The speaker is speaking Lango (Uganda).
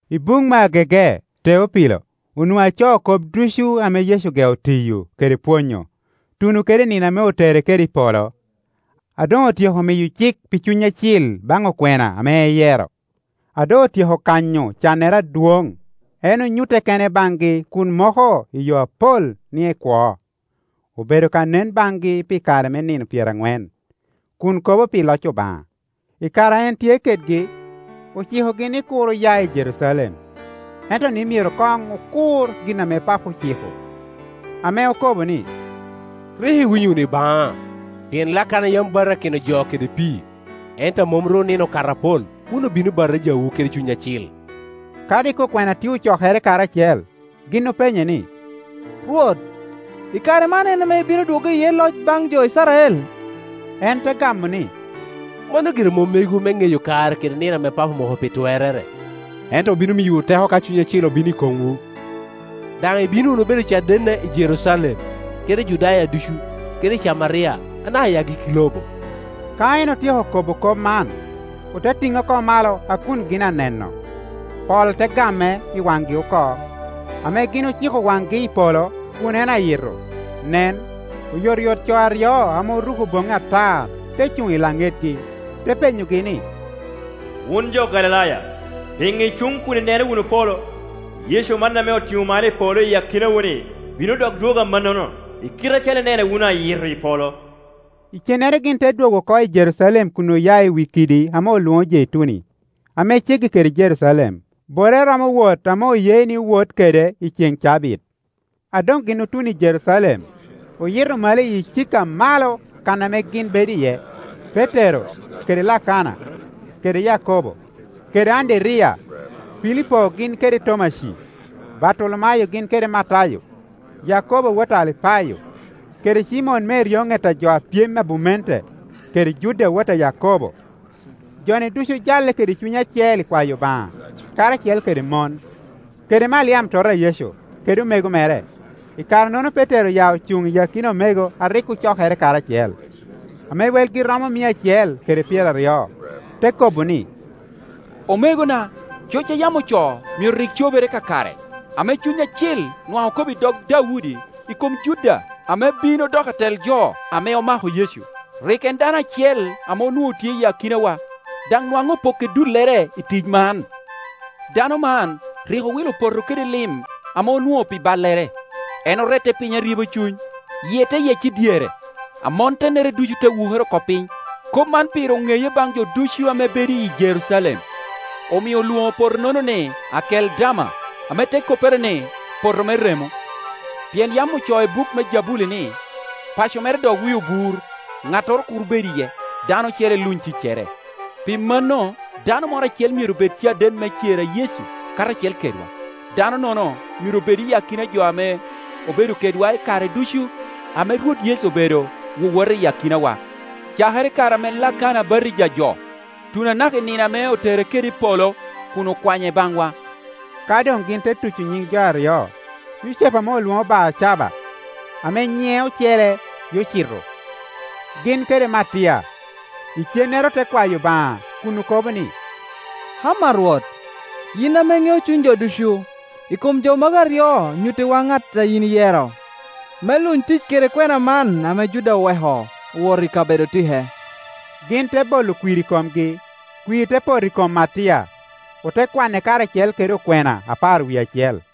I buk me agege, Teopilo, onwoŋo acoo kop ducu ame Yecu ogeo tiyo kede pwonyo, tuno kede i nino ame otere kede i polo, a doŋ otyeko miyo cik pi Cuny acil baŋ okwena ame eyero. A doŋ otyeko kanyo cannere adwoŋ, en onyutte kene baŋgi kun moko i yo apal ni ekwo. Obedo ka nen baŋgi pi kare me nino pyeraŋwen, kun kobo pi loc Obaŋa. I kare a en tye kedgi, ocikogi ni kur oya i Jerucalem, ento ni myero koŋ okur gin ame Papo ociko, ame okobo ni, “Rik iwinyo wunu i baŋa, pien Lakana yam batakino jo kede pii, ento a mom ru nino okato apol wun obino batijawu kede Cuny Acil.” Ka rik okwena tye ocokere karacel, gin openye ni, “Rwot, i kare man en ame ibino dwoggo iye loc baŋ jo Icrael?” En te gamo ni, “Mano gire mom megwu me ŋeyo kare kede nino ame Papo omoko pi twerrere. Ento obino miyowu teko ka Cuny Acil obino i komwu; daŋ ibino wunu bedo cadenna i Jerucalem, kede i Judaya ducu, kede i Camaria, anaka i agikki lobo,” Ka en otyeko kobo kop man, ote tiŋe oko malo a kun gin aneno, pol te game i waŋgi oko. Ame gin ociko waŋgi i polo kun en ayi to, nen, oyotoyot co aryo ame oruko boŋŋi atar te cuŋ i laŋetgi; te penyogi ni, “Wun jo Galilaya, piŋo icuŋ kun ineno wunu polo? Yecu man ame otiŋo malo i polo iyi akinawu-ni bino dok dwogo amannano, i kite acalo inene wunu ayito i polo.” Icennere gin te dwogo oko i Jerucalem kun oya i wi kidi ame olwoŋo Jeituni, ame ceggi kede Jerucalem, borrere romo wot ame oye ni wot kede i ceŋ cabit. A doŋ gin otuno i Jerucalem, oyito malo i icika a malo kan ame gin bedo iye; Petero, kede Lakana, kede Yakobo, kede Anderiya, Pilipo gin kede Tomaci, Bartolomayo gin kede Matayo, Yakobo wot a Alipayo, kede Cimon me eryoŋet a jo a pyem i abumente, kede Juda wot a Yakobo. Jo-ni ducu ojalle kede cuny acel i kwayo Obaŋa, karacel kede mon, kede Maliam tota a Yecu, kede omego mere. I kare-nono Petero oya ocuŋ i akina omego a rik ocokere karacel, ame welgi romo mia acel kede pyeraryo, te kobo ni, “Omegona, coc a yam ocoo myero rik cobere kakare, ame Cuny Acil nwaŋ okobo i dog Daudi i kom Juda ame bin odoko atel jo ame omako Yecu. Rik en dano acel ame onwoŋo tye i akinawa, daŋ nwaŋ opokke dullere i tic man.” (Dano man rik owilo poto kede lim ame onwoŋo pi ballere; en orette aryeba cuny, yie te yec i dyere, amontennere ducu te wukere oko piny. Kop man pire oŋeye baŋ jo ducu ame bedo i Jerucalem, omio olwoŋo poto-nono ni, Akeldama, ame te koppere ni, Poto me remo.) “Pien yam ocoo i buk me Jabuli ni, ‘Paco mere dok wi obur, ŋattoro kur bed iye’; ‘Dano ocele luny ticcere.’ Pi mano dano moro acel myero bed caden me cer a Yecu karacel kedwa. Dano-nono myero bed i akina jo ame obedo kedwa i kare ducu ame Rwot Yecu obedo wowota i akinawa, cakere i kare ame Lakana batija jo, tuno anaka i nino ame otere kede i polo kun okwanye i baŋwa.” Ka doŋ gin te tuco nyiŋ jo aryo; Yucepu ame olwoŋo Barcaba, ame nyiŋe ocele Yucito, gin kede Matia. Icennere ote kwayo Obaŋa kun okobo ni, “Ama Rwot, yin ame iŋeo cuny jo ducu, i kom jo magi aryo nyuttiwa ŋat a yin iyero me luny tic kede kwena man ame Juda oweko, owoto i kabedo otike.” Gin te bolo kwir i komgi, kwir te poto i kom Matia, ote kwane karacel kede okwena apar wie acel.